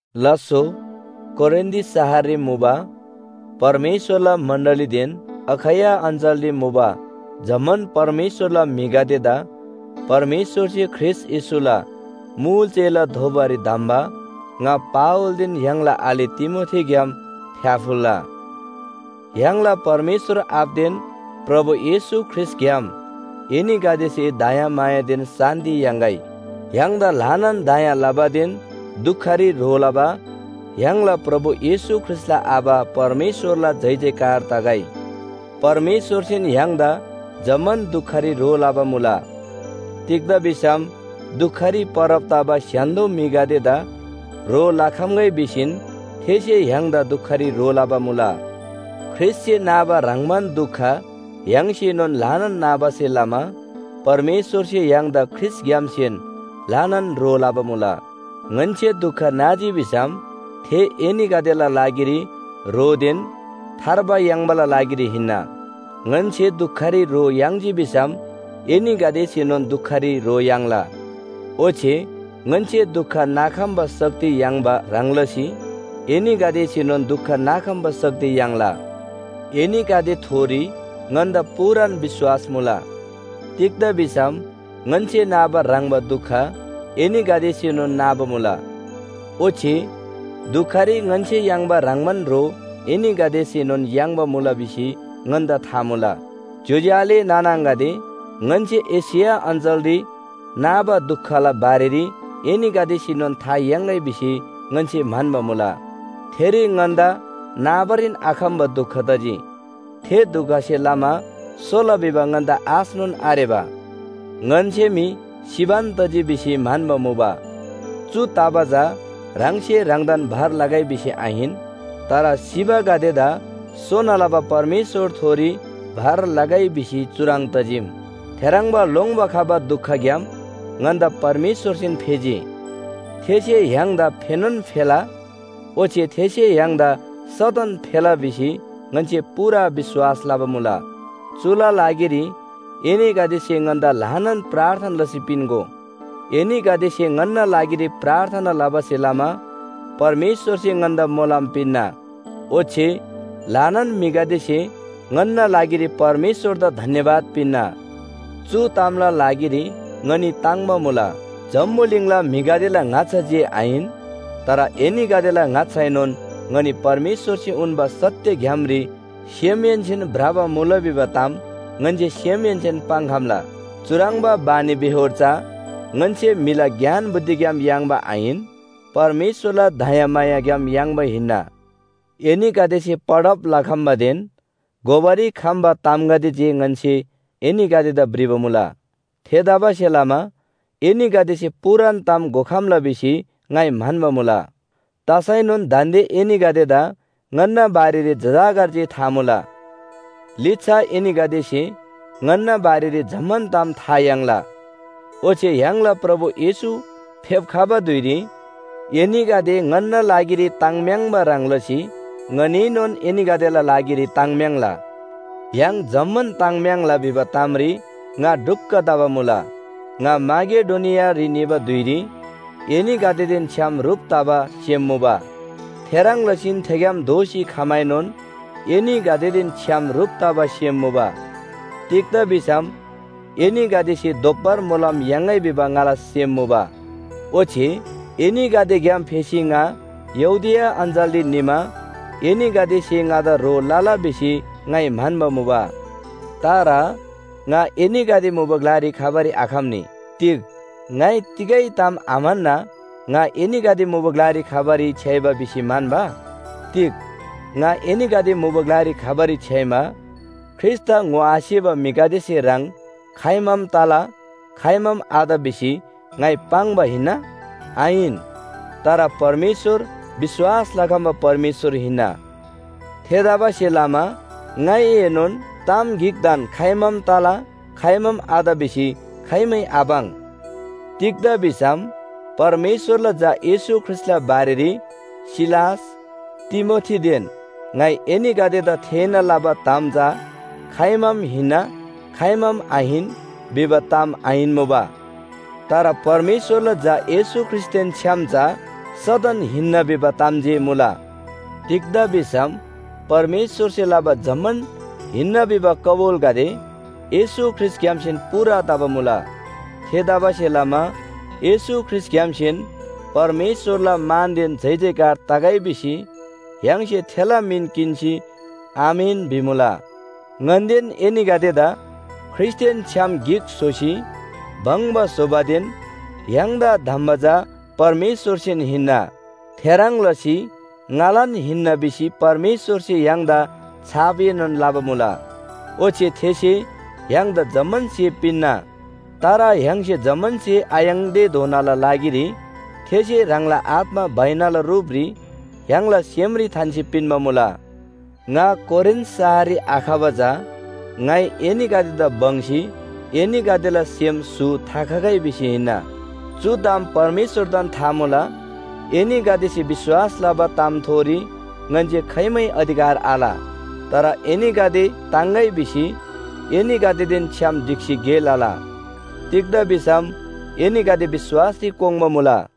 लास्‍सो, कोरिन्‍थ शहररी मुबा परमेश्‍वरला मण्‍डलीदेन अखैया अञ्‍चलरी मुबा जम्‍मान परमेश्‍वरला म्‍हिगदेदा परमेश्‍वरसे ख्रीष्‍ट येशूला मुल चेला दोबारी धम्‍बा ङा पावलदेन य्‍हाङला आले तिमोथीग्‍याम फ्‍याफुल्‍ला। य्‍हाङला परमेश्‍वर आबादेन प्रभु येशू ख्रीष्‍टग्‍याम एनीगदेसे दयामायादेन शान्‍ति याङ्‌गै। य्‍हाङदा ल्‍हानान दया लबादेन दुखरी ह्रो लबा य्‍हाङला प्रभु येशू ख्रीष्‍टला आबा परमेश्‍वरला जयजयकार तगै। परमेश्‍वरसेन य्‍हाङदा जम्‍मान दुखरी ह्रो लबा मुला। तिग्‍दा भिसम दुखरी परब तबा स्‍य्‍हान्‍दो म्‍हिगदेदा ह्रो लखम्‍गै भिसीन थेसे य्‍हाङदा दुखरी ह्रो लबा मुला। ख्रीष्‍टसे नाबा ह्रङ्‌बान दुख य्‍हाङसेनोन ल्‍हानान नाबासे लमा परमेश्‍वरसे य्‍हाङदा ख्रीष्‍टग्‍यामसेन ल्‍हानान ह्रो लबा मुला। ङन्‍से दुख नाजी भिसम थे एनीगदेला लागिरी ह्रोदेन थार्बा याङ्बाला लागिरी हिन्‍ना। ङन्‍से दुखरी ह्रो याङ्जी भिसम एनीगदेसेनोन दुखरी ह्रो याङ्ला। ओच्‍छे ङन्‍से दुख नाखम्‍बा शक्ति याङ्बा ह्रङ् लसी एनीगदेसेनोन दुख नाखम्‍बा शक्ति याङ्ला। एनीगदेथोरी ङन्‍दा पूरान विश्‍वास मुला। तिग्‍दा भिसम ङन्‍से नाबा ह्रङ्‌बा दुख एनीगदेसेनोन नाबा मुला, ओच्‍छे दुखरी ङन्‍से याङ्बा ह्रङ्‌बान ह्रो एनीगदेसेनोन याङ्बा मुला भिसी ङन्‍दा था मुला। ज्‍योज्‍यो आले नाना आङागदे, ङन्‍से एशिया अञ्‍चलरी नाबा दुखला बारेरी एनीगदेसेनोन था याङ्‌गै भिसी ङन्‍से म्‍हन्‍बा मुला। थेरी ङन्‍दा नाबारीन आखम्‍बा दुख तजी, थे दुखसे लमा सोला भिबा ङन्‍दा आशनोन आरेबा। ङन्‍से मी सिबान तजी भिसी म्‍हन्‍बा मुबा। चु तबा चा ह्राङसे ह्राङदान भर लगै भिसी आहिन, तर सिबागदेदा सोना लबा परमेश्‍वरथोरी भर लगै भिसी चुह्रङ् तजीम। थेह्रङ्बा लोङ्‌बा खबा दुखग्‍याम ङन्‍दा परमेश्‍वरसेन फेजी, थेसे य्‍हाङदा फेनोन फेला। ओच्‍छे थेसे य्‍हाङदा सदन फेला भिसी ङन्‍से पूरा विश्‍वास लबा मुला। चुला लागिरी एनीगदेसे ङन्‍दा ल्‍हानान प्रार्थना लसी पिन्‍गो। एनीगदेसे ङन्‍ना लागिरी प्रार्थना लबासे लमा परमेश्‍वरसे ङन्‍दा मोलम पिन्‍ना, ओच्‍छे ल्‍हानान म्‍हिगदेसे ङन्‍ना लागिरी परमेश्‍वरदा धन्‍यवाद पिन्‍ना। चु तामला लागिरी ङनी ताङ्‍बा मुला, जम्‍बुलिङला म्‍हिगदेला ङाच्‍छा जे आहिन, तर एनीगदेला ङाच्‍छाएनोन ङनी परमेश्‍वरसे उन्‍बा सत्‍य ग्‍यामरी सेमहेन्‍सेन भ्रबा मुला भिबा ताम ङन्‍से सेमहेन्‍सेन पाङ्‌खम्‍ला। चुह्रङ्बा बानीबेहोर चा ङन्‍से म्‍हिला ज्ञान बुद्धिग्‍याम याङ्बा आहिन, परमेश्‍वरला दयामायाग्‍याम याङ्बा हिन्‍ना। एनीगदेसे पढब लखम्‍बादेन घोबारी खम्‍बा तामगदे जे ङन्‍से एनीगदेदा भ्रिबा मुला। थेतबासेलमा एनीगदेसे पूरान ताम घोखम्‍ला भिसी ङाइ म्‍हन्‍बा मुला। तसैनोन दान्‍दे एनीगदेदा ङन्‍ना बारेरी जजाकर जे था मुला, लिच्‍छा एनीगदेसे ङन्‍ना बारेरी जम्‍मान ताम था याङ्ला। ओच्‍छे य्‍हाङला प्रभु येशू फेप्‍खबा धुइरी एनीगदे ङन्‍ना लागिरी ताङ्म्‍याङ्बा ह्रङ् लसी ङनीएनोन एनीगदेला लागिरी ताङ्म्‍याङ्ला। य्‍हाङ जम्‍मान ताङ्म्‍याङ्ला भिबा तामरी ङा ढुक्‍क तबा मुला। ङा माकेडोनियारी निबा धुइरी एनीगदेदेन छ्‌याम ह्रुप तबा सेम मुबा, थेह्रङ् लसीन थेग्‍याम दोःसी खमाएनोन एनीगदेदेन छ्‌याम ह्रुप तबा सेम मुबा। तिग्‍दा भिसम एनीगदेसे दोब्‍बर मोलम याङ्‌गै भिबा ङाला सेम मुबा। ओच्‍छे एनीगदेग्‍याम फेसी ङा यहूदिया अञ्‍चलरी निमा एनीगदेसे ङादा ह्रो लला भिसी ङाइ म्‍हन्‍बा मुबा। तर ङा एनीगदे मुबा ग्‍लारी खबारी आखम्‍नी। तिग ङाइ तिगै ताम आम्‍हन्‍ना ङा एनीगदे मुबा ग्‍लारी खबारी छ्‌याइबा भिसी म्‍हन्‍बा? तिग ङा एनीगदे मुबा ग्‍लारी खबारी छ्‌याइमा ख्रीष्‍टदा ङोआसेबा म्‍हिगदेसे ह्रङ् खाइमाम “तला” खाइमाम “आत” भिसी ङाइ पाङ्बा हिन्‍ना? आहिन। तर परमेश्‍वर विश्‍वास लखम्‍बा परमेश्‍वर हिन्‍ना। थेतबासेलमा ङाइएनोन ताम गिकदान खाइमाम “तला” खाइमाम “आत” भिसी खाइमै आपाङ्। तिग्‍दा भिसम परमेश्‍वरला झा येशू ख्रीष्‍टला बारेरी सिलास, तिमोथीदेन ङाइ एनीगदेदा थेःना लबा ताम चा खाइमाम “हिन्‍ना” खाइमाम “आहिन” भिबा ताम आहिन्‍मुबा। तर परमेश्‍वरला झा येशू ख्रीष्‍टदेन छ्‌याम चा सदन “हिन्‍ना” भिबा ताम जे मुला। तिग्‍दा भिसम परमेश्‍वरसे लबा जम्‍मान हिन्‍ना भिबा कबुलगदे येशू ख्रीष्‍टग्‍यामसेन पूरा तबा मुला। थेतबासेलमा येशू ख्रीष्‍टग्‍यामसेन परमेश्‍वरला मानदेन जयजयकार तगै भिसी य्‍हाङसे थेला मिन किन्‍सी, “आमेन” भिमुला। ङन्‍देन एनीगदेदा ख्रीष्‍टदेन छ्‌याम गिक स्‍होसी भङ्‍बा स्‍होबादेन य्‍हाङदा धम्‍बा चा परमेश्‍वरसेन हिन्‍ना। थेह्रङ् लसी ङालान हिन्‍ना भिसी परमेश्‍वरसे य्‍हाङदा छापएनोन लबा मुला। ओच्‍छे थेसे य्‍हाङदा जम्‍मान स्‍हे पिन्‍ना। तर य्‍हाङसे जम्‍मान स्‍हे आयाङ्देधोनाला लागिरी थेसे ह्राङला आत्‍मा बैनाला रूपरी य्‍हाङला सेमरी थान्‍सी पिन्‍बा मुला। ङा कोरिन्‍थ शहररी आखबा चा ङाइ एनीगदेदा बङ्‌सी एनीगदेला सेम स्‍हु थाखगै भिसी हिन्‍ना। चु ताम परमेश्‍वरदान था मुला। एनीगदेसे विश्‍वास लबा तामथोरी ङन्‍से खाइमै अधिकार आल। तर एनीगदे ताङ्‌गै भिसी एनीगदेदेन छ्‌याम ढिक्‍सी गे लला। तिग्‍दा भिसम एनीगदे विश्‍वासरी कोङ्बा मुला।